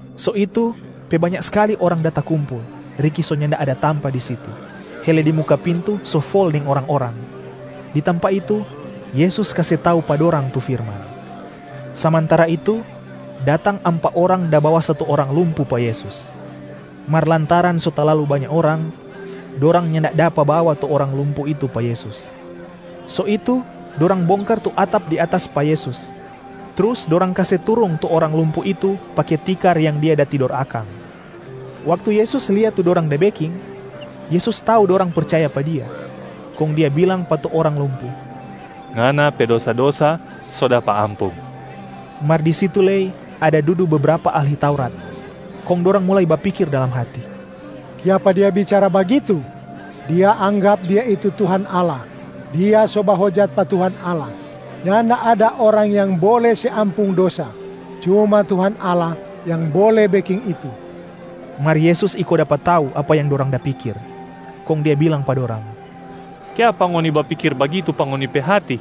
So itu pe banya skali orang da takumpul riki so nyanda ada tampa di situ, hele di muka pintu so fol deng orang-orang. Di tampa itu, Yesus kase tau pa dorang tu firman. Samantara itu, datang ampa orang da bawa satu orang lumpu pa Yesus. Mar lantaran so talalu banya orang, dorang nyanda dapa bawa tu orang lumpu itu pa Yesus. So itu dorang bongkar tu atap di atas pa Yesus, trus dorang kase turung tu orang lumpu itu pake tikar yang dia da tidor akang. Waktu Yesus lia tu dorang da beking, Yesus tau dorang percaya pa Dia, kong Dia bilang pa tu orang lumpu, “Ngana pe dosa-dosa so dapa ampung.” Mar di situ lei ada dudu bebrapa ahli Taurat, kong dorang mulai bapikir dalam hati, “Kiapa Dia bicara bagitu? Dia anggap Dia itu Tuhan Allah, Dia so bahojat pa Tuhan Allah. Nyanda ada orang yang bole se ampung dosa, cuma Tuhan Allah yang bole beking itu.” Mar Yesus iko dapa tau apa yang dorang da pikir, kong Dia bilang pa dorang, “Kiapa ngoni bapikir bagitu pa ngoni pe hati?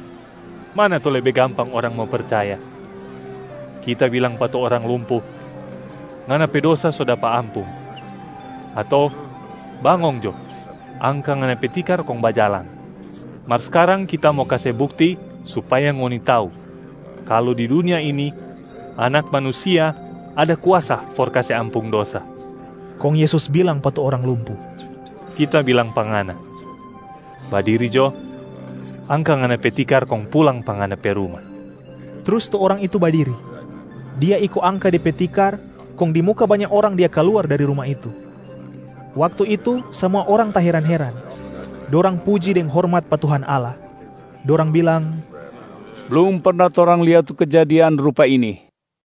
Mana tu lebe gampang orang mo percaya, Kita bilang pa tu orang lumpu, ‘Ngana pe dosa so dapa ampung,’ ato, ‘Bangong jo, angka ngana pe tikar kong bajalang.’ Mar skarang Kita mo kase bukti supaya ngoni tau kalu di dunia ini Anak Manusia ada kuasa for kase ampung dosa.” Kong Yesus bilang pa tu orang lumpu, “Kita bilang pa ngana, badiri jo, angka ngana pe tikar kong pulang pa ngana pe ruma!” Trus tu orang itu badiri, dia iko angka de pe tikar, kong di muka banya orang dia kaluar dari ruma itu. Waktu itu samua orang taheran-heran. Dorang puji deng hormat pa Tuhan Allah, dorang bilang, “Blum perna torang lia tu kejadian rupa ini.”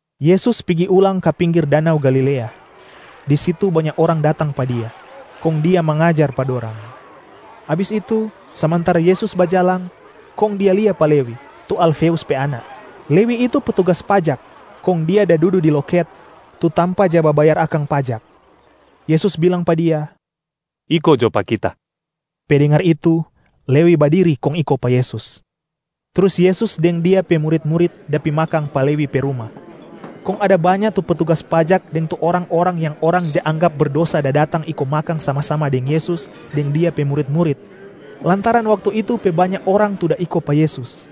Yesus pigi ulang ka pinggir danau Galilea. Di situ banya orang datang pa Dia, kong Dia mangajar pa dorang. Abis itu, samantara Yesus bajalang kong Dia lia pa Lewi, tu Alfeus pe anak. Lewi itu petugas pajak kong dia da dudu di loket, tu tampa ja babayar akang pajak. Yesus bilang pa dia, “Iko jo pa Kita.” Pe dengar itu, Lewi badiri kong iko pa Yesus. Trus Yesus deng Dia pe murit-murit da pi makang pa Lewi pe ruma, kong ada banya tu petugas pajak deng tu orang-orang yang orang ja anggap berdosa da datang iko makang sama-sama deng Yesus deng Dia pe murit-murit, lantaran waktu itu pe banya orang tu da iko pa Yesus.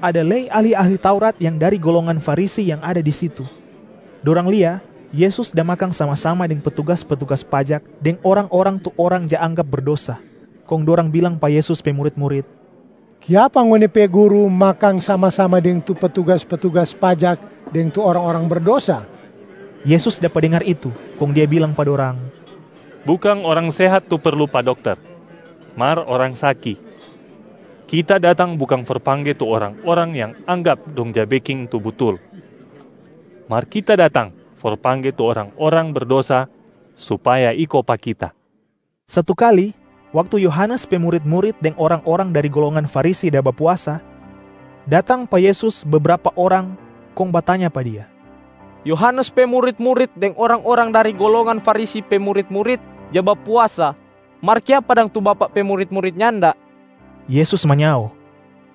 Ada lei ahli-ahli Taurat yang dari golongan Farisi yang ada di situ. Dorang lia Yesus da makang sama-sama deng petugas-petugas pajak deng orang-orang tu orang ja anggap berdosa, kong dorang bilang pa Yesus pe murit-murit, “Kiapa ngoni pe Guru makang sama-sama deng tu petugas-petugas pajak deng tu orang-orang berdosa?” Yesus dapa dengar itu kong Dia bilang pa dorang, “Bukang orang sehat tu perlu pa dokter, mar orang saki. Kita datang bukang for pangge tu orang-orang yang anggap dong ja beking tu butul, mar Kita datang for pangge tu orang-orang berdosa supaya iko pa Kita.” Satu kali, waktu Yohanes pe murit-murit deng orang-orang dari golongan Farisi da bapuasa, datang pa Yesus bebrapa orang kong batanya pa Dia, “Yohanes pe murit-murit deng orang-orang dari golongan Farisi pe murit-murit ja bapuasa, mar kiapa dang tu Bapak pe murit-murit nyanda?” Yesus manyao,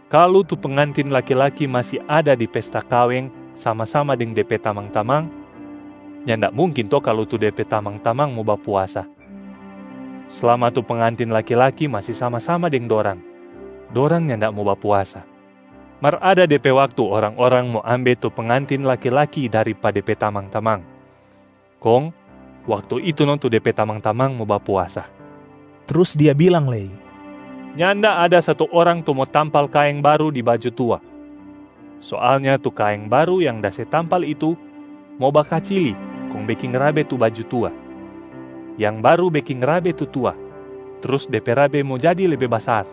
“Kalu tu pengantin laki-laki masi ada di pesta kaweng sama-sama deng de pe tamang-tamang, nyanda mungkin to kalu tu de pe tamang-tamang mo bapuasa. Slama tu pengantin laki-laki masi sama-sama deng dorang, dorang nyanda mo bapuasa. Mar ada de pe waktu orang-orang mo ambe tu pengantin laki-laki dari pa de pe tamang-tamang, kong waktu itu no tu de pe tamang-tamang mo bapuasa.”a Trus Dia bilang lei, “Nyanda ada satu orang tu mo tampal kaeng baru di baju tua. Soalnya tu kaeng baru yang da se tampal itu mo bakacili kong beking rabe tu baju tua, yang baru beking rabe tu tua, trus de pe rabe mo jadi lebe basar.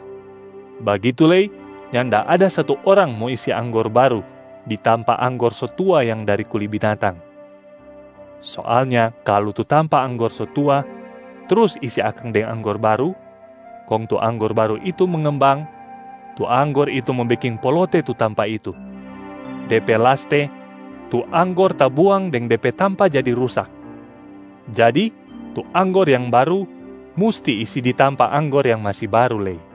Bagitu lei, nyanda ada satu orang mo isi anggor baru di tampa anggor so tua yang dari kuli binatang. Soalnya kalu tu tampa anggor so tua, trus isi akang deng anggor baru, kong tu anggor baru itu mengembang, tu anggor itu mo beking polote tu tampa itu. De pe laste, tu anggor tabuang deng de pe tampa jadi rusak. Jadi tu anggor yang baru musti isi di tampa anggor yang masi baru lei.”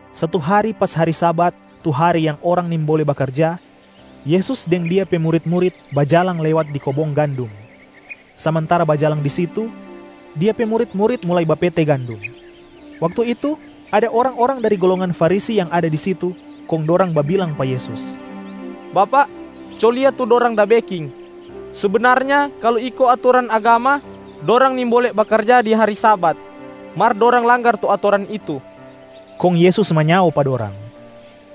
Satu hari pas hari Sabat, tu hari yang orang nimbole bakarja, Yesus deng Dia pe murit-murit bajalang lewat di kobong gandum. Samantara bajalang di situ, Dia pe murit-murit mulai bapete gandum. Waktu itu, ada orang-orang dari golongan Farisi yang ada di situ, kong dorang babilang pa Yesus, “Bapak, co lia tu dorang da beking! Sebenarnya kalu iko atoran agama, dorang nimbole bakarja di hari Sabat, mar dorang langgar tu atoran itu.” Kong Yesus manyao pa dorang,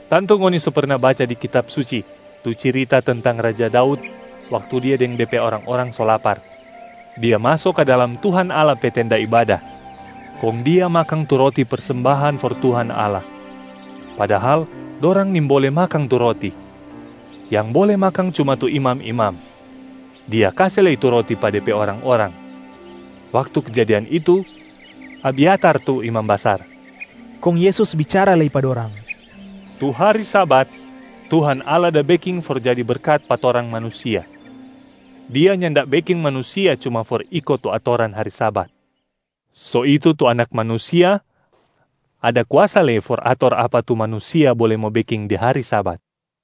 “Tantu ngoni so perna baca di Kitab Suci tu cirita tentang raja Daud waktu dia deng de pe orang-orang so lapar. Dia maso ka dalam Tuhan Allah pe tenda ibada, kong dia makang tu roti persembahan for Tuhan Allah, padahal dorang nimbole makang tu roti, yang bole makang cuma tu imam-imam. Dia kase lei tu roti pa de pe orang-orang. Waktu kejadian itu, Abyatar tu imam basar.” Kong Yesus bicara lei pa dorang, “Tu hari Sabat, Tuhan Allah da beking for jadi berkat pa torang manusia, Dia nyanda beking manusia cuma for iko tu atoran hari Sabat. So itu tu Anak Manusia ada kuasa lei for ator apa tu manusia bole mo beking di hari Sabat.”